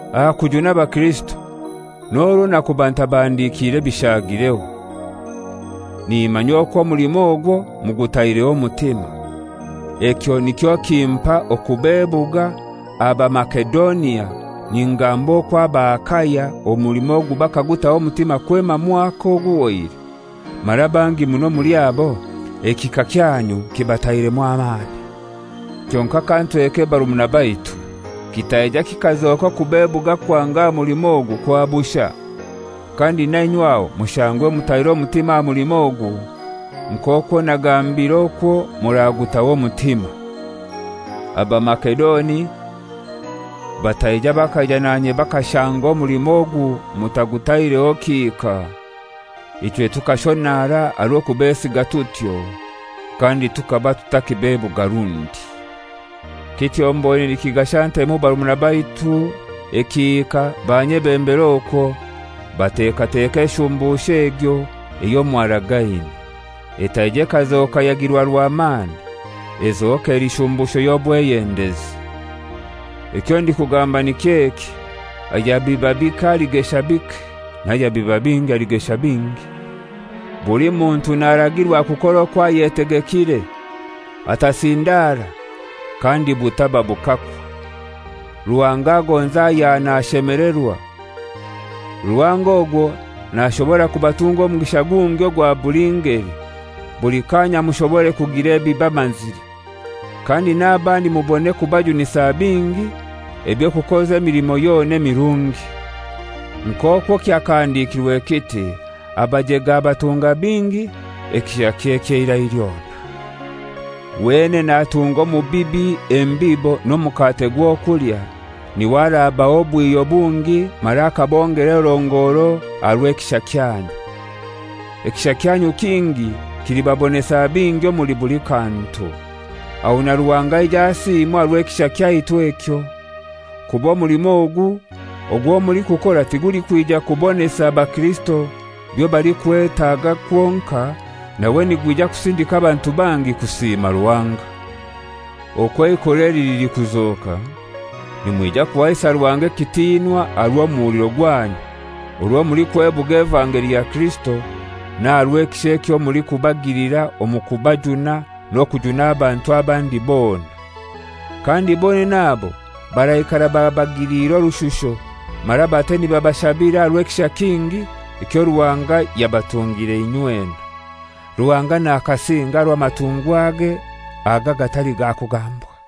Aha kujuna abakirisito n'orwo nakuba ntabahandikire bishaagireho. Nimanya okwo omulimo ogwo mugutaireho omutima; ekyo nikyo kimpa okubebuga aha Bamasedonia ningamba okwo aba Akaya omulimo bakagutaho omutima kwema mwaka oguhoire, mara bangi muno omuli abo ekihika kyanyu kibatairemu amani. Kyonkai kantweke barumuna baitu, kitaija kikazoka okubebuga kwange aha mulimo ogu kwa bushai, kandi na inywe aho mushangwe mutaire omutima aha mulimo ogu, nk'okwo nagambire okwo muragutaho omutima; Abamasedoni bataija bakaija nanye bakashanga omulimo ogu mutagutaireho kihika, ichwe tukashonara aha rw'okubesiga tutyo, kandi tukaba tutakibebuga rundi. Kityo mboine nikigasha ntemu barumuna baitu ekihika banyebembere okwo, batekateke eshumbusho egyo eyo mwaragaine, etaija ekazoka yagirwa rwamani, ezoke eli shumbusho y'obweyendezi. Ekyo ndikugamba niky'eki: Ayabiba bike aligesha bike, n'ayabiba bingi aligesha bingi. Buli muntu naragirwa kukora okwo ayetegekire: Atasindara, kandi butaba bukakwa. Ruhanga agonza ayaha nashemelerwa. Ruhanga ogwo nashobora kubatunga omugisha gungi ogwa buli ngeli, buli kanya mushobore kugira ebibamazire, kandi n'abandi mubone kubajunisa bingi eby'okukoza emilimo yona emirungi. Nk'okwo kyakahandikirwe kiti; «Abajege abatunga bingi, ekishakye ky'eirai lyona.» Wenene atunga omubibi embibo n'omukate gw'okulya, n'iwe arabaha obwihyo bungi mara akabongera erongoro aha rw'ekisha kyanyu. Ekisha kyanyu kingi kilibabonesa bingi omuli buli kantu, aho na Ruhanga aije asiimwe aha rw'ekisha kyaitu ekyo. Kuba omulimo ogu ogwo mulikukora tigulikwija kubonesa bakirisito byo balikwetaga kwonkai, nawe nigwija kusindika abantu bangi kusiima Ruhanga. Okwo eikora eli lilikuzoka, nimwija kuhaisa Ruhanga ekitinwa aha rw'omuhuliro gwanyu orwo mulikwebuga evangeli ya Kirisito, n'aha rw'ekisha ekyo mulikubagilira omu kubajuna n'okujuna abantu abandi bona. Kandi bonene abo baraikara babagiliire orushusho, mara bate nibabashabira aha rw'ekisha kingi ekyo Ruhanga yabatungire inywena. Ruhanga nakasinge aha rw'amatungwage aga agatali ga kugambwa.